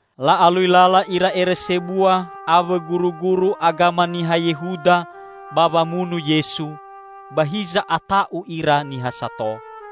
La'alui lala ira ere sebua awõ guruguru agama niha Yehuda ba wamunu Yesu; ba hiza ata'u ira niha sato.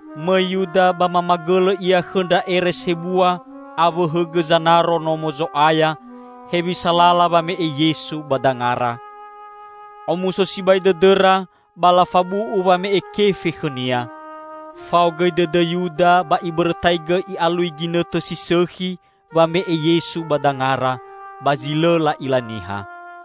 Mõi Yuda ba mamagõlõ ia khõ ndra ere sebua awõ hõgõ zanaro Nomo Zo'aya hewisa lala wame'e Yesu ba dangara. Omuso sibai dõdõra ba lafabu'u wame'e kefe khõnia. Fao gõi dõdõ Yuda ba ibõrõtaigõ i'alui ginõtõ si sõkhi wame'e Yesu ba dangara, ba zi lõ la'ila niha.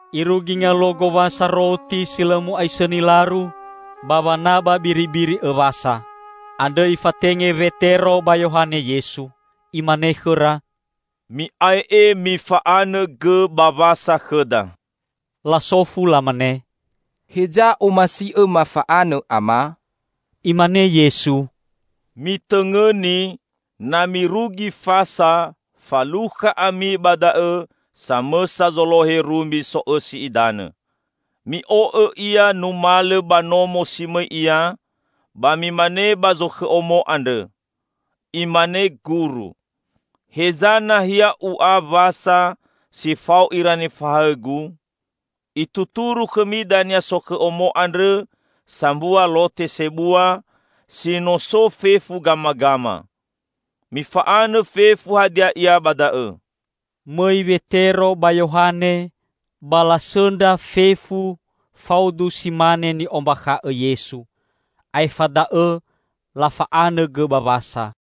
Irugi ngaluo Gowasa Roti si Lõ Mu'aisõni laru, ba wanaba biribiri õ Wasa. Andrõ Ifatenge Wetero ba Yohane Yesu. Imane khõra, "Mi'ae'e mifa'anõ gõ ba Wasa khõda." Lasofu lamane, "Heza omasi'õ mafa'anõ, Ama?" Imane Yesu, "Mitõngõni, na mirugi fasa, falukha ami ba da'õ samõsa zolohe rumbi so'õsi idanõ. Mi'o'õ ia numalõ ba nomo si mõi ia, ba mimane ba zokhõ omo andrõ: Imane Guru, 'Heza nahia U'a Wasa si fao ira nifahaõ-Gu?' Ituturu khõmi dania sokhõ omo andrõ sambua lote sebua, si no so fefu gamagama. Mifa'anõ fefu hadia ia ba da'õ." Mõi Wetero ba Yohane ba lasõndra fefu faudu si mane ni'ombakha'õ Yesu. Aefa da'õ lafa'anõ gõ ba Wasa.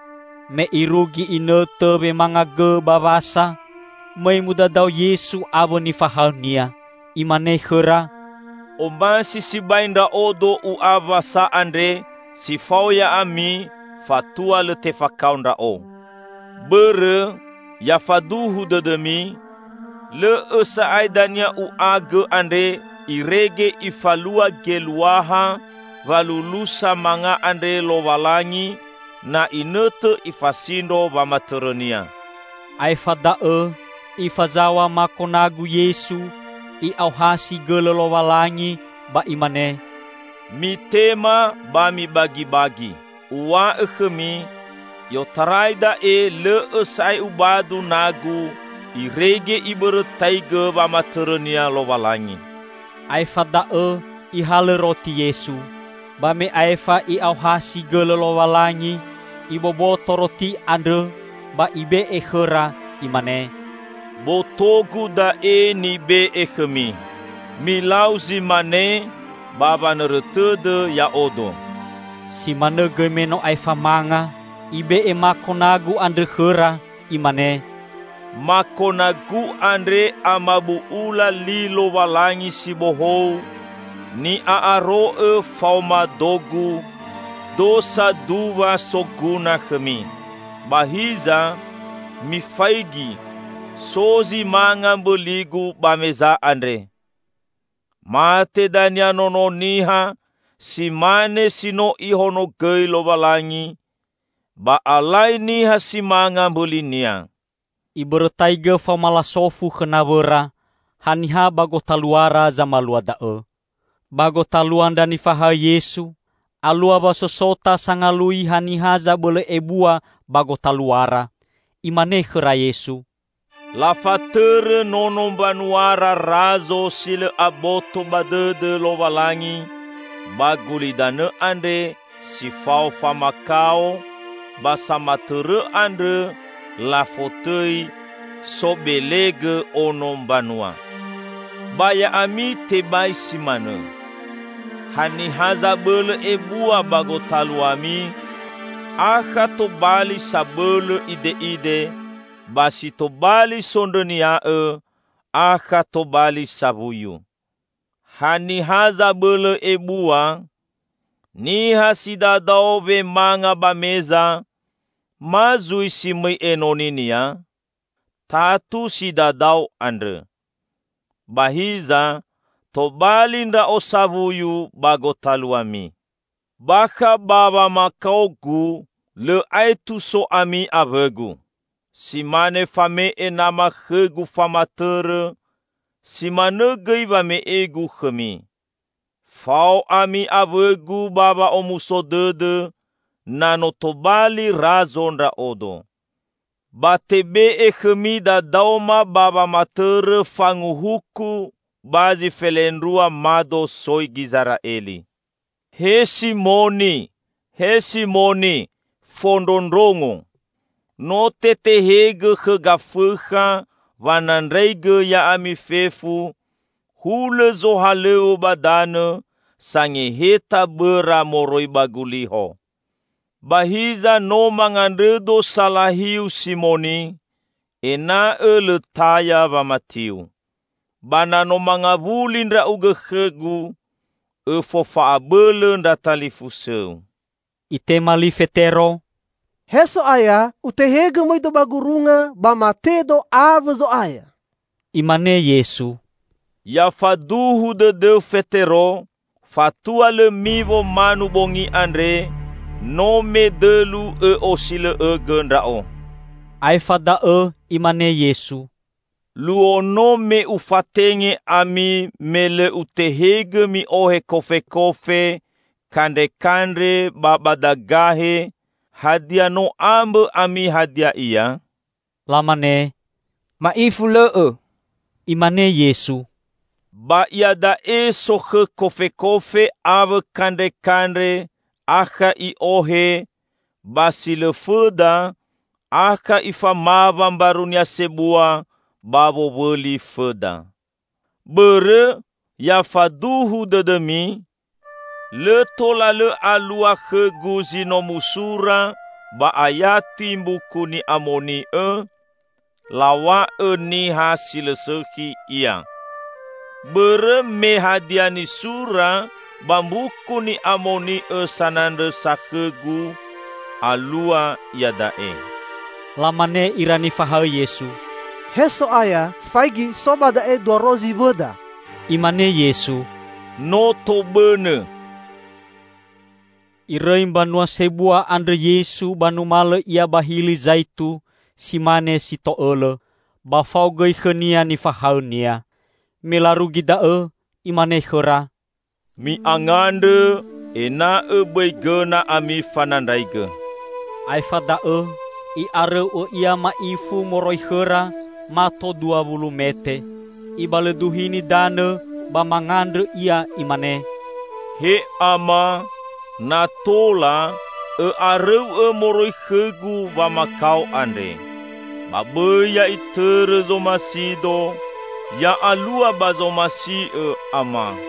Me irugi inõtõ wemanga gõ ba Wasa, mõi mudadao Yesu awõ nifahaõ-Nia. Imane khõra, "Omasi sibai Ndra'odo U'a Wasa andre si fao ya'ami fatua lõ tefakao Ndra'o! Bõrõ, ya faduhu dõdõmi: Lõ'õ sa'ae dania U'a gõ andre irege Ifalua geluaha walulusa manga andre Lowalangi na inõtõ Ifasindro wamatõrõ-Nia." Aefa da'õ Ifazaw̃a mako nagu Yesu, I'aohasi gõlõ Lowalangi, ba Imane, "Mitema ba mibagibagi; Uw̃a'õ khõmi, i'otarai da'e lõ'õ sa'ae Ubadu nagu irege Ibõrõtaigõ wamatõrõ-Nia Lowalangi." Aefa da'õ Ihalõ roti Yesu. Ba me aefa I'aohasi gõlõ Lowalangi, Iboboto roti andrõ; ba Ibe'e khõra, Imane: "Boto-Gu da'e [nibe'e khõmi. Milau zi mane ba wanõrõ tõdõ Ya'odo."] [Si manõ gõi me no aefa manga, Ibe'e mako nagu andrõ khõra, Imane, "Mako nagu andre amabu'ula li Lowalangi si bohou, ni'a'aro'õ faoma do-Gu -- do saduwa soguna khõmi."] "Ba hiza, mifaigi! So zi manga mbõligu ba meza andre! Mate dania Nono Niha si mane si no Ihonogõi Lowalangi; ba alai niha si manga mbõli-Nia!" Ibõrõtaigõ faoma lasofu khõ nawõra, haniha ba gotaluara zamalua da'õ. Ba gotalua ndra nifahaõ Yesu alua wasosota sangalui haniha zabõlõ ebua ba gotaluara. Imane khõra Yesu, "Lafatõrõ nono mbanuara razo si lõ aboto ba dõdõ Lowalangi ba gulidanõ andre si fao famakao, ba samatõrõ andrõ lafotõi 'Sobelegõ Ono Mbanua'. Ba ya'ami tebai si manõ. Haniha zabõlõ ebua ba gotaluami akha tobali sabõlõ ide'ide, ba si tobali sondrõnia'õ, akha tobali sawuyu. Haniha zabõlõ ebua: Niha si dadao wemanga ba meza, ma zui si mõi enoninia? Tatu si dadao andrõ. Ba hiza tobali Ndra'o sawuyu ba gotaluami. Bakha ba wamakao-Gu, lõ aetu so ami awõ-Gu. Si mane fame'e nama khõ-Gu famatõrõ, si manõ gõi wame'e-Gu khõmi. Fao ami awõ-Gu ba wa'omuso dõdõ na no tobali Razo Ndra'odo. Ba tebe'e khõmi dadaoma ba wamatõrõ fanguhuku ba zi felendrua mado soi Gizera'eli." "He Simoni, he Simoni, fondrondrongo! No tetehõgõ khõ Gafõkha wanandraigõ ya'ami fefu, hulõ zohalõw̃õ ba danõ sangeheta bõra moroi ba guliho. Ba hiza no mangandrõ-Do salahiu, Simoni, ena'õ lõ taya wamatiu. Ba na no mangawuli ndra'ugõ khõ-Gu, õfofa'abõlõ ndra talilfusõu." Itema li Fetero, "He So'aya, utehegõ mõido ba gurunga ba matedo awõ Zo'aya!" Imane Yesu, "Ya faduhu dõdõu, Fetero, fatua lõ miwo manu bongi andre, no medõlu õ'osilõ'õgõ Ndra'o." Aefa da'õ Imane Yesu, "Luo no me Ufatenge ami me lõ Utehegõ mi'ohe kofekofe, kandrekandre ba badagahe, hadia no ambõ ami hadia ia?" Lamane, "Ma'ifu lõ'õ." Imane Yesu, "Ba iada'e sokhõ kofekofe awõ kandrekandre akha i'ohe; ba si lõ fõda, akha ifamawa mbarunia sebua ba wowõli fõda. Bõrõ, ya faduhu dõdõmi! Lõ tola lõ alua khõ-Gu zi no musura ba ayati Mbuku Ni'amoni'õ, 'Law̃a'õ niha si lõ sõkhi Ia.' Bõrõ me hadia nisura ba Mbuku Ni'amoni'õ sanandrõsa khõ-Gu alua iada'e." Lamane ira nifahaõ Yesu, "He So'aya, faigi so ba da'e dua rozi wõda." Imane Yesu, "No tobõnõ!" Irõi mbanua sebua andrõ Yesu ba numalõ Ia ba Hili Zaitu si mane si to'õlõ, ba fao gõi khõ-Nia nifahaõ-Nia. Me larugi da'õ, Imane khõra, "Mi'angandrõ ena'õ bõi gõna ami fanandraigõ." Aefa da'õ I'arõu'õ Ia ma'ifu moroi khõra, mato dua wulu mete, Ibalõduhini danõ ba mangandrõ Ia, Imane, "He Ama, na tola, Õ'arõu'õ moroi khõ-Gu wamakao andre. Ba bõi ya'itõrõ zomasi-Do, ya'alua ba zomasi'Õ, Ama!"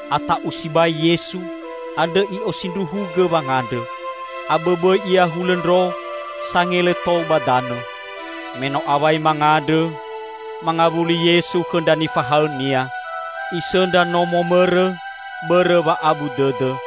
[Ata'u sibai Yesu, andrõ I'osindruhugõ wangandrõ. Abõbõi Ia hulõ ndro, sangele tou ba danõ.] Me no awai mangandrõ, mangawuli Yesu khõ ndra nifahaõ-Nia. Isõndra no momõrõ, bõrõ wa'abu dõdõ.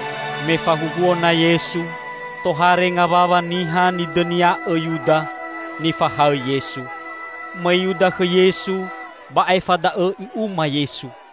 Me fahuhuo na Yesu, tohare ngawawa niha nidõnia'õ Yuda, nifahaõ Yesu. Mõi Yuda khõ Yesu ba aefa da'õ i'uma Yesu.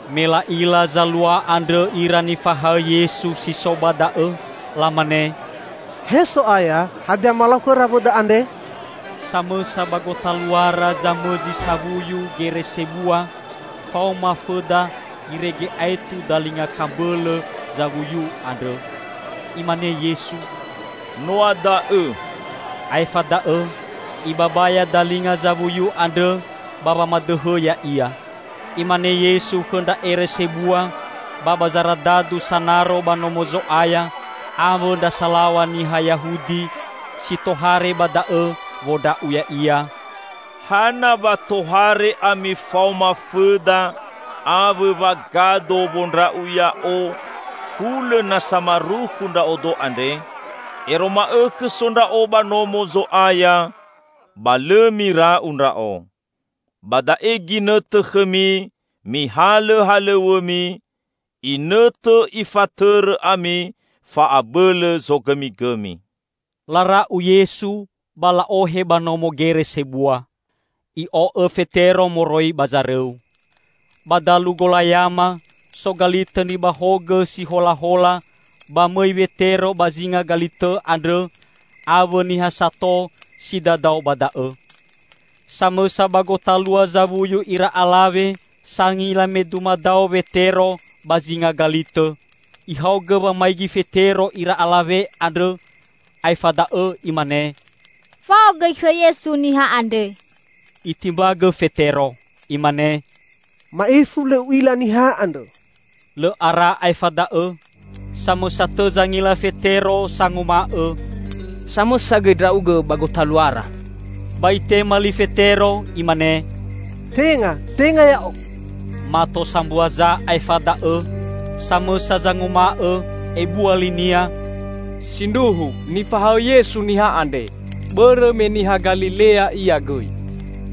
Me la'ila zalua andrõ ira nifahaõ Yesu si so ba da'õ, lamane, "He So'aya, hadia malau khõra wõda andre?" Samõsa ba gotaluara zamõzi sawuyu gere sebua faoma fõda irege aetu dalinga kambõlõ zawuyu andrõ. Imane Yesu, "Noa da'õ!" Aefa da'õ Ibabaya dalinga zawuyu andrõ ba wamadõhõ ya'ia. Imane Yesu khõ ndra ere sebua ba ba zaradadu sanaro ba Nomo Zo'aya, awõ ndra salaw̃a niha Yahudi si tohare ba da'õ wondra'u Ya'ia, "Hana wa tohare ami faoma fõda awõ wagado wondra'u Ya'o, hulõ na samarukhu Ndra'odo andre? Ero ma'õkhõ so Ndra'odo ba Nomo Zo'aya, ba lõ mira'u Ndra'o. Ba da'e ginõtõ khõmi mihalõ halõw̃õmi, inõtõ ifatõrõ ami fa'abõlõ zogõmigõmi." Lara'u Yesu ba la'ohe ba nomo gere sebua. I'o'õ Fetero moroi ba zarõu. Ba dalu golayama so galitõ nibahogõ si holahola ba mõi Wetero ba zinga galitõ andrõ awõ niha sato si dadao ba da'õ. Samõsa ba gotalua zawuyu ira alawe sangila me dumadao Wetero ba zinga galitõ; ihaogõ wamaigi Fetero ira alawe andrõ, aefa da'õ imane, "Fao gõi khõ Yesu niha andre!" Itimbagõ Fetero. Imane, "Ma'ifu lõ u'ila Niha andrõ!" Lõ ara aefa da'õ, samõsa tõ zangila Fetero sanguma'õ, "Samõsa gõi ndra'ugõ ba gotaluara!" Ba itema li Fetero, imane, "Tenga, tenga ya'o!" Mato sambua za aefa da'õ, samõsa zanguma'õ, ebua linia, "Sindruhu nifahaõ Yesu niha andre, bõrõ me niha Galilea ia gõi!"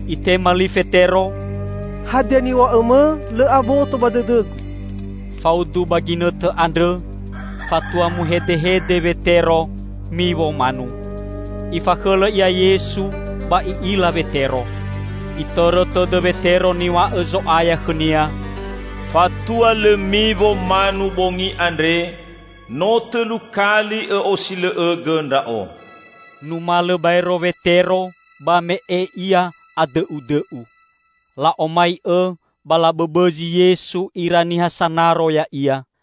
Itema li Fetero, "Hadia niw̃a'õmõ, lõ aboto ba dõdõgu!" Faudu ba ginõtõ andrõ, fatua muhedehede Wetero, miwo manu. Ifakhõlõ Ia Yesu ba I'ila Wetero. Itõrõ tõdõ Wetero niw̃a'õ Zo'aya khõnia, "Fatua lõ miwo manu bongi andre, no tõlu kali õ'osilõ'õgõ Ndra'o." Numalõ baero Wetero ba me'e ia adõ'udõ'u. La'omai'õ ba labõbõzi Yesu ira niha sanaro Ya'ia.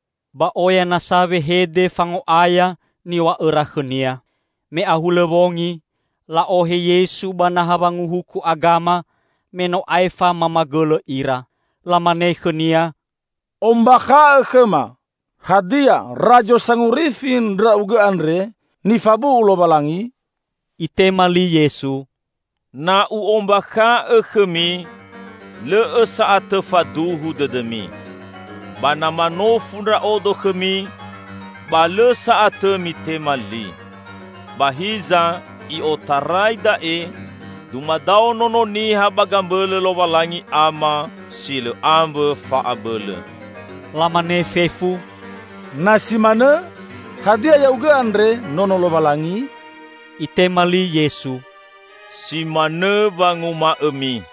Ba oya nasa wehede fango'aya niw̃a'õra khõ-Nia. Me ahulõ wongi, la'ohe Yesu ba naha wanguhuku agama, me no aefa mamagõlõ ira. Lamane khõ-Nia, "Ombakha'õ khõma, hadia Razo Sangorifi Ndra'ugõ andre nifabu'u Lowalangi?" Itema li Yesu, "Na U'ombakha'õ khõmi, lõ'õ sa'atõ faduhu dõdõmi. Ba na manofu Ndra'odo khõmi, ba lõ sa'atõ mitema li. Ba hiza i'otarai da'e, dumadao Nono Niha ba gambõlõ Lowalangi Ama si lõ ambõ fa'abõlõ." Lamane fefu, "Na si manõ, hadia Ya'ugõ andre Nono Lowalangi?" Itema li Yesu, "Si manõ wanguma'õmi."